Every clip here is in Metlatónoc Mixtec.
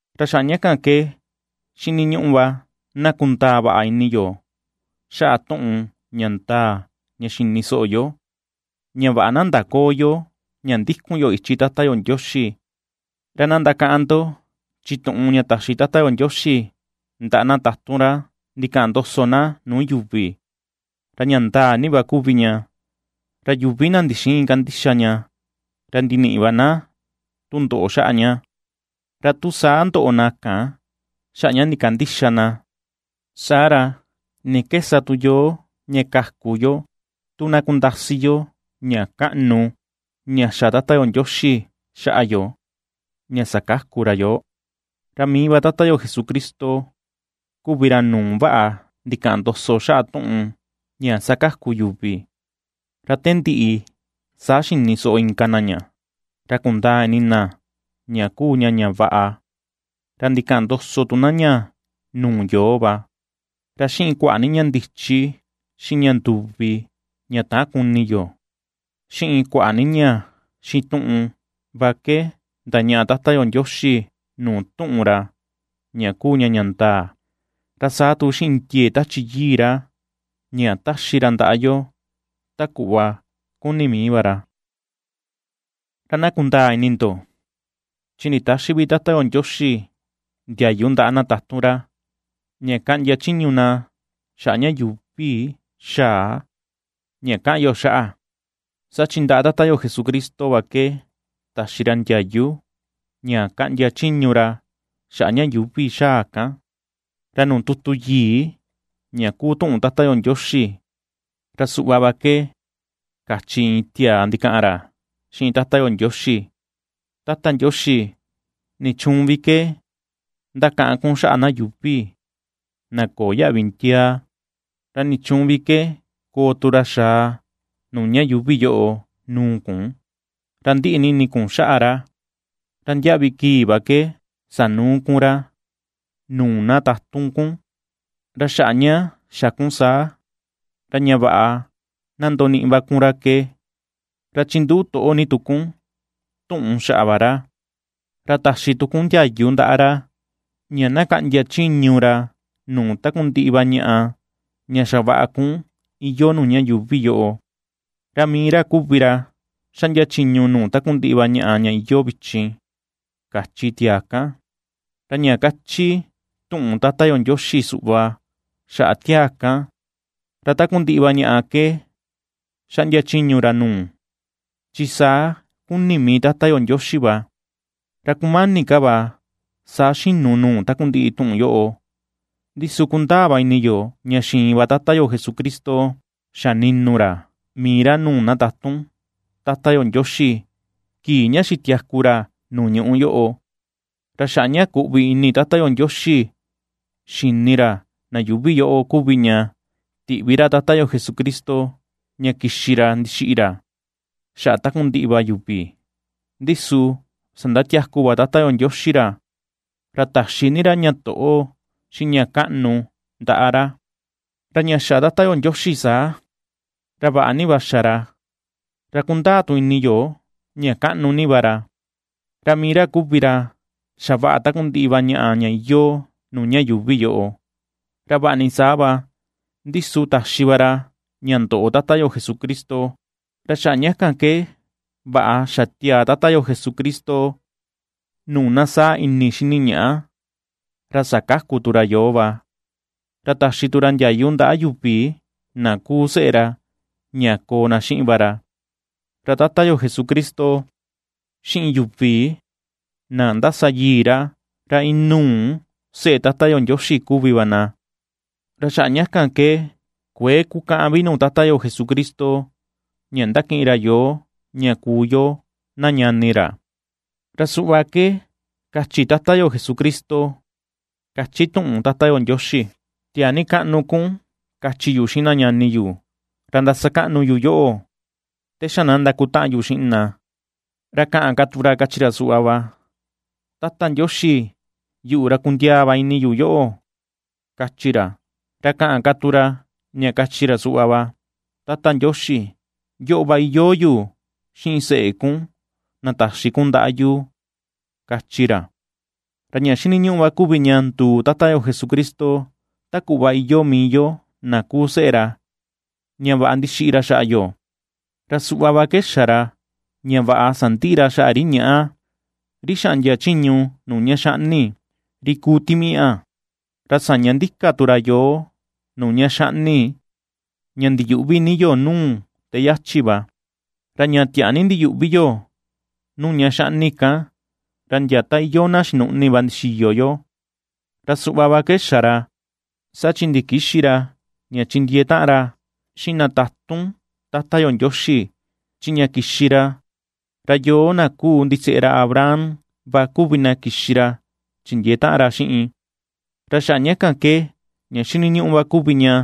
Ra xaꞌa ña kan ke xiniñuꞌu ni va na kundaa vaꞌa ini yo xaꞌa tuꞌun ña ndaa ña xa xini soꞌo yo, ña vaꞌa na ndaköo yo ña ndikun yo ichi Tata yo Ndioxi. Ra na ndakaꞌan ndo, chi tuꞌun ña taxi Tata yo Ndioxi ndaꞌa na tatun ra ndikaꞌan ndoso na nuu yuvi, ra ña ndaa ni va kuvi ña, ra yuvi na ndixïin kandixa ña, ra ndiniꞌi va na tundoꞌo xaꞌa ña. Ra tu saa ndoꞌo na kan xaꞌa ña ndikandïxa na, saa ra, ¿ni ke sa tu yoo ña kaku yo tu na kundasi yo ña kaꞌnu ña xa Tata yo Ndioxi xaꞌa yo ña sakaku ra yoo? Ra mii va Tata yo Jesucristo kuvi ra nuu vaꞌa ndikaꞌan ndoso xaꞌa tuꞌun ña sakaku yuvi; ra te ndiꞌi, saa xini soꞌo inka na ña, ra kundaa ini na ña kuu ña ña vaꞌa. Ra ndikaꞌan ndoso tu na ña nuu yoo va. Ra xiꞌin kuaꞌa ni ña ndichi, xiꞌin ña nduvi, ña täan kuni yo, xiꞌin kuaꞌa ni ña xituꞌun va ke ndañaꞌa Tata yo Ndioxi nuu tuꞌun ra ña kuu ña ña ndaa, ra saa tu xiꞌin ndiee Tachi Yii ra ña ^taxi ra ndaꞌa yo ta kuꞌva ^kuni mii va ra. Ra na kundaa ini ndo, chi nditäxi vi Tata yo Ndioxi ndiayu ndaꞌa na tatun ra, ña kaꞌndia chiñu na xaꞌa ña yuuvi xa̱a, ña kaꞌan yo xaꞌa, saa chi ndaꞌa Tata yo Jesucristo va ke taxi ra ndiayu ña kaꞌndia chiñu ra xaꞌa ña yuuvi xa̱a kan. Ra nuu tutu yii ña kuu tuꞌun Tata yo Ndioxi, ra suꞌva va ke kachi iin tiaa ndikaꞌan ra xiꞌin Tata yo Ndioxi: Tata Ndioxi, ¿nichuun vi ke ndakaꞌan kun xaꞌa na yuuvi, na köo yaꞌvi ndiaa? ¿Ra nichuun vi ke koo tu ra xa̱à nuu ña yuuvi yoꞌo nuu kun, ña ndiꞌi ni ini kun xaꞌa ra? Ra ndiaꞌvi kii va ke sanuu kun ra nuu na tatun kun, ra xaꞌa ña xa kun saa, ra ña vaꞌa na ndoniꞌi va kun ra ke, ra chinduꞌu toꞌo ni tu kun tuꞌun xaꞌa va ra, ra taxi tu kun ndiayu ndaꞌa ra, ña na kaꞌndia chiñu ra nuu takundiꞌi va ñaꞌa, ña xavaꞌa kun iyoo nuu ña yuuvi yoꞌo; ra mii ra kuvi ra xaꞌndia chiñu nuu takundiꞌi va ñaꞌa ña iyoo vichin, kachi tiaa kan. Ra ña kachi tuꞌun Tata yo Ndioxi suꞌva xaꞌa tiaa kan, ra takundiꞌi va ñaꞌa ke xaꞌndia chiñu ra nuu, chi saa ^kuni mii Tata yo Ndioxi va. Ra kumani ka va saa xinu nuu takundiꞌi tuꞌun yoꞌo. Ndi su kundaa va ini yo ña xiin va Tata yo Jesucristo xa ninu ra mii ra nuu na tatun Tata yo Ndioxi kii ña xitiaku ra nuu ñuꞌu yoꞌo. Ra xaꞌa ña kuꞌvi ini Tata yo Ndioxi xini ra na yuuvi yoꞌo va kuvi ña tiꞌvi ra Tata yo Jesucristo ña kixi ra ndixiꞌi ra xaꞌa takundiꞌi va yuvi; ndi su sandatiaku va Tata yo Ndioxi ra, ra taxi ni ra ña toꞌo, xiꞌin ña kaꞌnu ndaꞌa ra. Ra ña xa Tata yo Ndioxi saa, ra vaꞌa ni va xa ra, ra kundaa tu ini yo ña kaꞌnu ni va ra, ra mii ra kuvi ra xavaꞌa takundiꞌi va ñaꞌa ña iyoo nuu ña yuuvi yoꞌo; ra vaꞌa ni saa va, ndi su taxi va ra ña ndoꞌo Tata yo Jesucristo, ra xaꞌa ña kan ke vaꞌa xatiaa Tata yo Jesucristo nuu na saa ini xini ñaꞌa, ra sakaku tu ra yoo va, ra taxi tu ra ndiayu ndaꞌa yuvi na kuu seꞌe ra ña koo na xiꞌin va ra. Ra Tata yo Jesucristo xiꞌin yuvi na ^ndasayii ra, ra inuu seꞌe Tata yo Ndioxi kuvi va na. Ra xaꞌa ña kan ke kuëe kukäꞌan vi nuu Tata yo Jesucristo, ña ^ndakiꞌin ra yoo ña kuu yo na ñani ra. Ra suꞌva ke kachi Tata yo Jesucristo, ^kachi tuꞌun Tata yo Ndioxi: Tiaa ni kaꞌnu kun kachi yu xiꞌin na ñani yu, ra ndasakaꞌnu yu yoꞌo, te xa na ndakutaꞌan yu xiꞌin na. Ra kaꞌan ka tu ra, kachi ra suꞌva va: Tata Ndioxi, yuꞌu ra kundiaa va ini yu yoꞌo, kachi ra. Ra kaꞌan tu ra, ña kachi ra suꞌva va: Tata Ndioxi, yoꞌo va iyoo yu xiꞌin seꞌe kun na taxi kun ndaꞌa yu, kachi ra. Ra ña xiniñuꞌu va kuvi ña nduu Tata yo Jesucristo ta kuꞌva iyoo mii yo na kuu seꞌe ra, ña vaꞌa ndixiꞌi ra xaꞌa yo; ra suꞌva va ke xa ra ña vaꞌa sandiꞌi ra xaꞌa ri ñaꞌa, ri xaꞌndia chiñu nuu ña xaꞌni, ri kuu timiaꞌa. Ra saña ndika tu ra yoo nuu ña xaꞌni, ña ndiyuꞌvi ni yo nuu te yachi va; ra ña tiaa ni ndiyuꞌvi yo nuu ña xaꞌni kan, ra ndia ta iyoo na xinuꞌni va ndixiyo yo. Ra suꞌva va ke xa ra, saa chi ndikïxi ra ña chindiee taꞌan ra xiꞌin na tatun Tata yo Ndioxi, chi ña kixi ra, ra yoo na kuu ndiseꞌe ra Abraham va kuvi na kixi ra chindiee taꞌan ra xiꞌin. Ra xaꞌa ña kan ke ña xiniñuꞌu va kuvi ña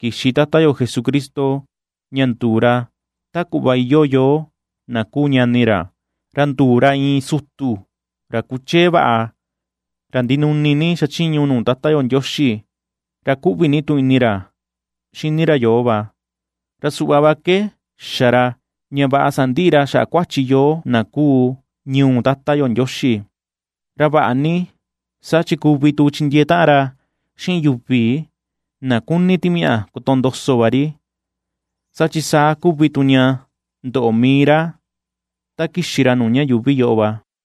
kixi Tata yo Jesucristo ña nduu ra ta kuꞌva iyoo yoo na kuu ñani ra, ra nduu ra iin sutu ra kuchee vaꞌa, ra ndinuni ni ^xachiñu nuu Tata yo Ndioxi, ra ^kuꞌvi ni tu ini ra xini ra yoo va. Ra suꞌva va ke xa ra, ña vaꞌa sandiꞌi ra xaꞌa kuachi yoo na kuu ñuu Tata yo Ndioxi. Ra vaꞌa ni, saa chi kuvi tu chindiee taꞌan ra xiꞌin yuvi na kuni timiaꞌa kotondoso va ri, saa chi saa kuvi tu ña ndoꞌo mii ra ta kixi ra nuu ña yuuvi yoꞌo va.